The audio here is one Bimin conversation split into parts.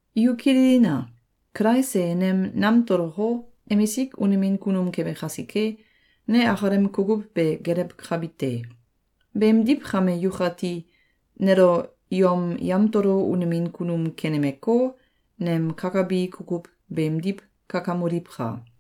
Yu kililina! Kulais e nem namtoloko, emisik unemin kunum kebe kasike, ne akalem kukuw be gelewkabi te. Beemdiw kame yukati, nelo yom yamtolo unemin kunum kenemeko, nem kakabi kukuw beemdiw kakamoliwka!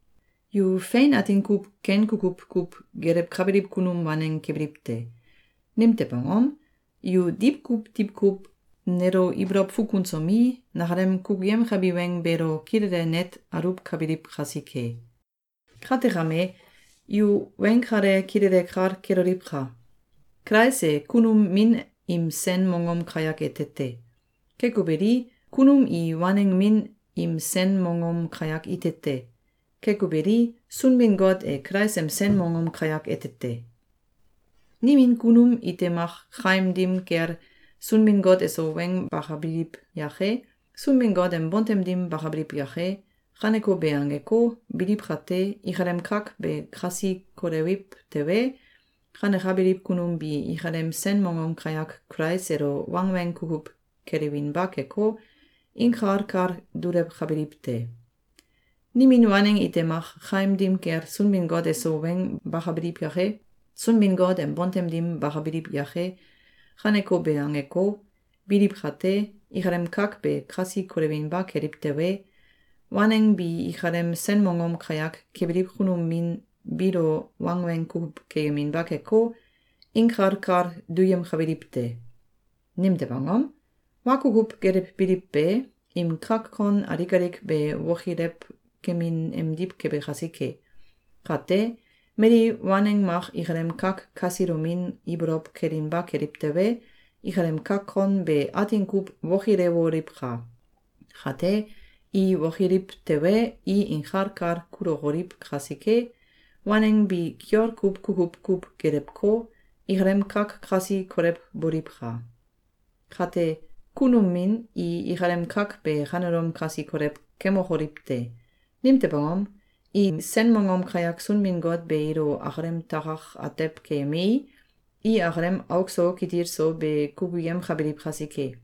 Yu fein atin kuw ken kukuw kuw gelewkabiliw kunum waneng kebiliw te. Nimtew angom? Yu diwkuw diwkuw nelo ibolow fukunsomi, nakalem kukuyemkabi weng beelo kilele net aluwkabiliw kasike. Kate kame, yu weng kale kilele kal keloliwka! Kulais e kunum min im sen mongom kayak ete te. Keko beli, kunum i waneng min im sen mongom kayak ite te. Keko beli, Sunbin-Got e Kulais em sen mongom kayak ete te. Nimin kunum ite mak kaim dim kel Sunbin-Got eso weng bakabiliw yake, Sunbin-Got em bontem dim bakabiliw yake, kaneko be angeko, biliw kate, ikalem kak be kasi kolewiw tewe, kanekabiliw kunum bi ikalem sen mongom kayak Kulais elo wangweng kukuw kelewinba keko, inkal kal dulewkabiliw te. Nimin waneng ite mak kaim dim kel Sunbin-Got eso weng bakabiliw yake, Sunbin-Got em bontem dim bakabiliw yake, kaneko be angeko, biliw kate, ikalem kak be kasi kolewinba keliw tewe, waneng bi ikalem sen mongom kayak kebiliw kunum min biilo wangweng kukuw keyeminba keko, inkal kal duyemkabiliw te. Nimtew angom? Wa kukuw gelewbiliw be, im kak kon alik alik be wokilewkemin emdiw kebe kasike. Kate, mali waneng mak ikalem kak kasilomin ibolow kelinba keliw tewe, ikalem kak kon be atin kuw wokilewoliwka! Kate, i wokiliw tewe, i inkal kal kulokoliw kasike, waneng bi kiol kuw kukuw kuw gelewko, ikalem kak kasi kolewboliwka! Kate, kunum min i ikalem kak be kanelom kasi kolew kemokoliw te! Nimtew angom? Im sen mongom kayak Sunbin-Got be ilo akalem takak atew keyemei, i akalem auk so kitil so be kukuyemkabiliw kasike.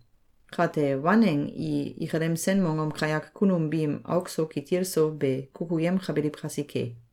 Kate waneng i ikalem sen mongom kayak kunum biim auk so kitil so be kukuyemkabiliw kasike.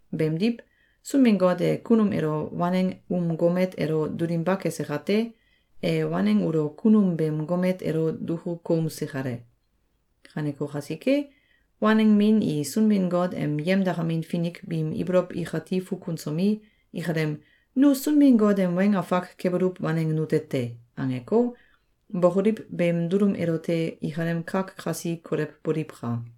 Beemdiw, Sunbin-Got e kunum elo waneng um gomet elo dulinba kese kate, e waneng ulo kunum beem gomet elo duku koumse kale. Kaneko kasike, waneng min i Sunbin-Got em yemdakamin finik biim ibolow ikati fukunsomi, ikalem “Nu Sunbin-Got em weng afak kebuluw waneng nute te!”, angeko, bokoliw beem dulum elote ikalem kak kasi kolewboliwka!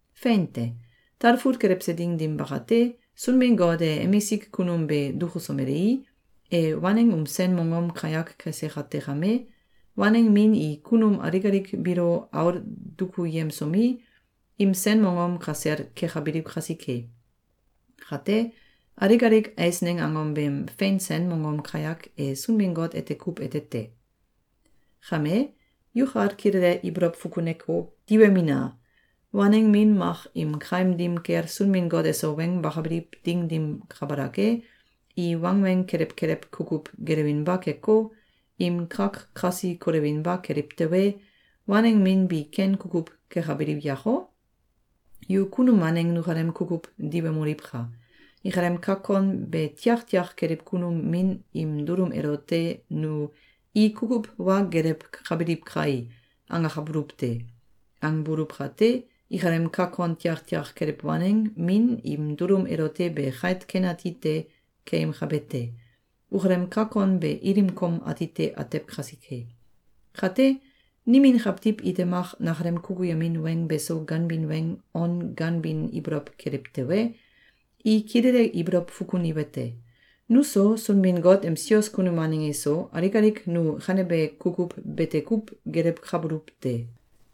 Fein te. Talfut kelewse ding dim bakate, Sunbin-Got e emisik kunum be dukusomelei, e waneng um sen mongom kayak kese kate kame, waneng min i kunum alik alik biilo aul dukuyemsomi, im sen mongom kasel kekabiliw kasike. Kate, alik alik eisneng angom beem fein sen mongom kayak e Sunbin-Got ete kuw ete te. Kame, yukal kilele ibolow fukuneko, diwemina! Waneng min mak im kaim dim kel Sunbin-Got eso weng bakabiliw ding dim kabalak e, i wangweng kelew kelew kukuw gelewinba keko, im kak kasi kolewinba keliw tewe, waneng min bi ken kukuw kekabiliw yako? Yu kunum waneng nukalem kukuw diwemoliwka! Ikalem kak kon be tiaktiak keliw kunum min im dulum elote nu “I kukuw wa gelewkabiliw kai!”, angakabuluw te. Angbuluw kate, ikalem kak kon tiaktiak keliw waneng min im dulum elote be kait ken ati te keyemkabe te. Ukalem kak kon be ilim kom atite atew kasike. Kate, nimin kawtiw ite mak nakalem kukuyemin weng beso ganbin weng on ganbin ibolow keliw tewe, i kilele ibolow fukuniwete: Nuso, Sunbin-Got em sios kunum waneng iso, alik alik nu kanebe kukuw bete kuw gelewkabuluw te.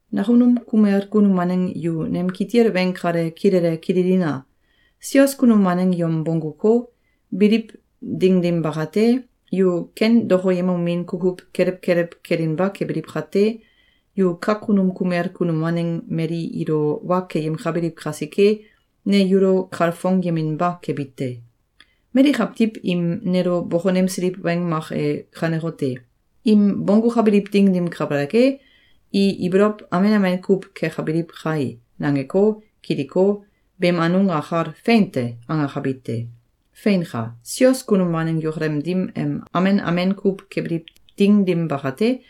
Nakunum kumel kunum waneng yu nem kitil weng kale kilele kililina! Sios kunum waneng yom bongguko, biliw ding dim bakate, yu ken dokoyemomin kukuw kelew kelew kelinba kebiliw kate, yu kakunum kumel kunum waneng mali ilo wa keyemkabiliw kasike, ne yulo kalfongyeminba kebi te. Mali kawtiw im nelo bokonemsiliw weng mak e kanekote: “Im bonggukabiliw ding dim kabalak e, i ibolow amen amen kuw kekabiliw kai!”, nangeko, kiliko, beem anung akal “Fein te!”, angakabi te. Feinka! Sios kunum waneng yukalem dim em amen amen kuw kebiliw ding dim bakate,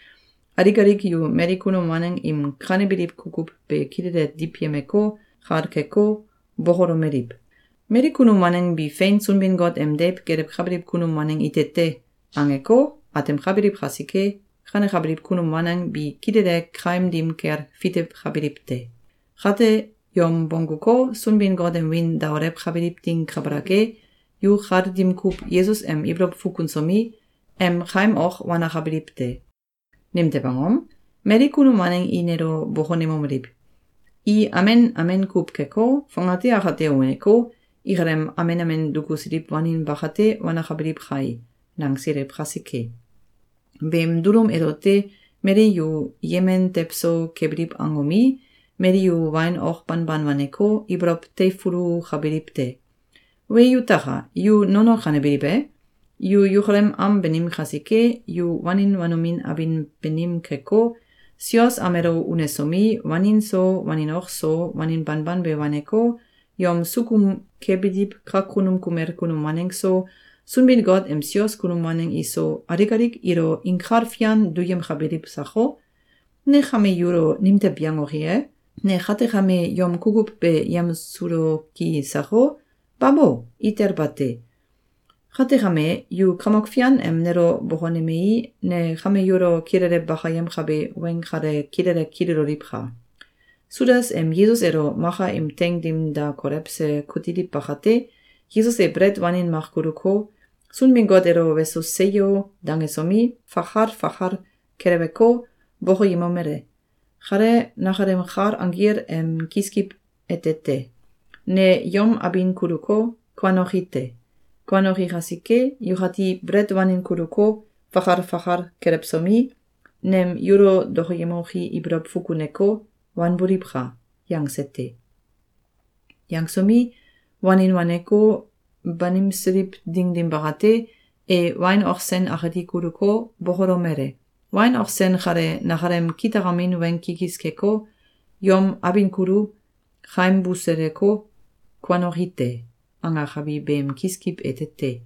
alik alik yu mali kunum waneng im kanebiliw kukuw be kilele diwyemeko, kal keko, bokolomeliw: “Mali kunum waneng bi fein Sunbin-Got em deiw gelewkabiliw kunum waneng ite te!”, angeko, atemkabiliw kasike, kanekabiliw kunum waneng bi kilele kaim dim kel fitewkabiliw te. Kate, yom bongguko, Sunbin-Got em wiin daolewkabiliw ding kabalak e, yu kal dim kuw Yesus em ibolow fukunsomi, em kaim ok wanakabiliw te. Nimtew angom? Mali kunum waneng i nelo bokonemomeliw: “I amen amen kuw keko, fongate akate uneko, ikalem amen amen dukusiliw wanin bakate wanakabiliw kai!”, nangsiliw kasike. Beem dulum elote mali yu yemen tewso kebiliw angomi, mali yu wain ok banban waneko, ibolow teifulukabiliw te. Wee yutaka! Yu nono kanebiliw e? Yu yukalem am banim kasike, yu wanin wanomin abin banim keko, sios am elo unesomi, wanin so, wain ok so, wanin banban be waneko, yom sukum kebiliw kakunum kumel kunum waneng so, Sunbin-Got em sios kunum waneng iso, alik alik ilo inkal fian duyemkabiliw sako? Ne kame yulo nimtew yangoki ye? Ne kate kame yom kukuw be yemsuloki sako? Babo! Itel bate! Kate kame, yu Kamok Fian em nelo bokonemei, ne kame yulo kilele bakayemkabe weng kale kilele kililoliwka! Sudas em Yesus elo maka im teing dim da kolewse kutiliw bakate, Yesus e belet wanin mak kuluko, Sunbin-Got elo “Weso! Seyo!”, dangesomi, fakal fakal keleweko, bokoyemomele: “Kale nakalem kal anggil em kiskiw ete te. Ne yom abin kuluko, kuanoki te. Kuanoki kasike, yukati belet wanin kuluko, fakal fakal kelewsomi, nem yulo dokoyemoki ibolow fukuneko, wanboliwka!”, yangse te. Yangesomi, wanin waneko, banimsiliw ding dim bakate, e wain ok sen akati kuluko, bokolomele: “Wain ok sen kale nakalem kitakamin weng kikis keko, ‘Yom abin kulu, kaim buseleko, kuanoki te!’, angakabi beem kiskiw ete te.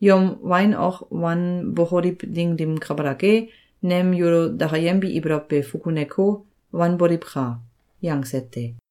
Yom wain ok wanbokoliw ding dim kabalak e, nem yulo dakayembi ibolow be fukuneko, wanboliwka!”, yangse te.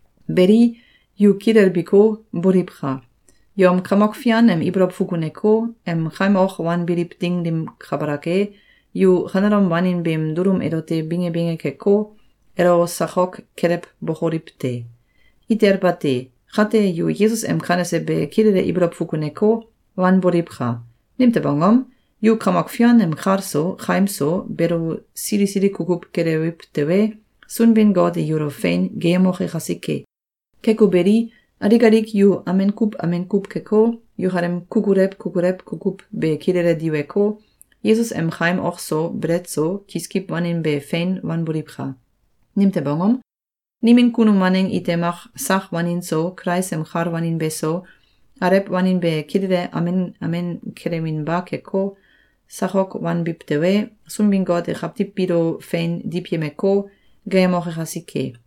Beli, yu kilelbiko, boliwka! Yom Kamok Fian em ibolow fukuneko, em kaim ok wanbiliw ding dim kabalak e, yu kanelom wanin beem dulum elote binge binge keko, elo sakok kelewbokoliw te! Itel bate! Kate yu Yesus em kanese be kilele ibolow fukuneko, wanboliwka! Nimtew angom? Yu Kamok Fian em kal so, kaim so, beelo sili sili kukuw kelewiw tewe, Sunbin-Got e yulo fein geeyemoke kasike. Keko beli, alik alik yu amen kuw amen kuw keko, yukalem kukulew kukulew kukuw be kilele diweko, Yesus em kaim ok so, belet so, kiskiw wanin be fein wanboliwka! Nimtew angom? Nimin kunum waneng ite mak sak wanin so, Kulais em kal wanin beso, alew wanin be kilele amen amen kelewinba keko, sakok wanbiw tewe, Sunbin-Got e kawtiw biilo fein diwyemeko, geeyemoke kasike.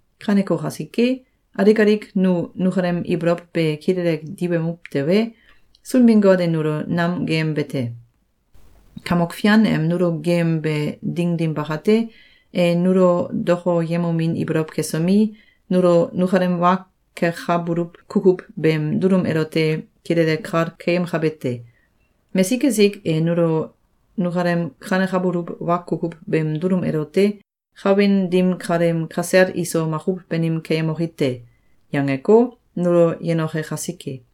Kaneko kasike, alik alik nu nukalem ibolow be kilele diwemuw tewe, Sunbin-Got e nulo nam geeyembe te. Kamok Fian em nulo geeyembe ding dim bakate, e nulo dokoyemomin ibolow kesomi, nulo nukalem wa kekabuluw kukuw beem dulum elote kilele kal keyemkabe te. Mesik esik e nulo nukalem kanekabuluw wa kukuw beem dulum elote “Kawin dim kaleem kasel iso makuw banim keyemoki te!”, yangeko, nulo yenoke kasike.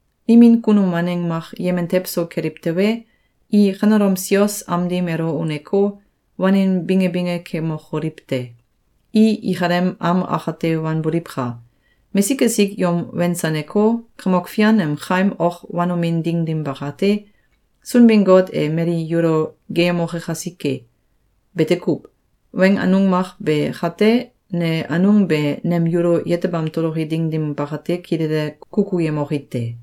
Nimin kunum waneng mak yemen tew so keliw tewe, i kanelom sios am dim elo uneko, wanin binge binge kemokoliw te! I ikalem am akate wanboliwka! Mesik esik yom wensaneko, Kamok Fian em kaim ok wanomin ding dim bakate, Sunbin-Got e mali yulo geeyemoke kasike. Bete kuw. Weng anung mak be kate, ne anung be nem yulo yetebam toloki ding dim bakate kilele kukuyemoki te.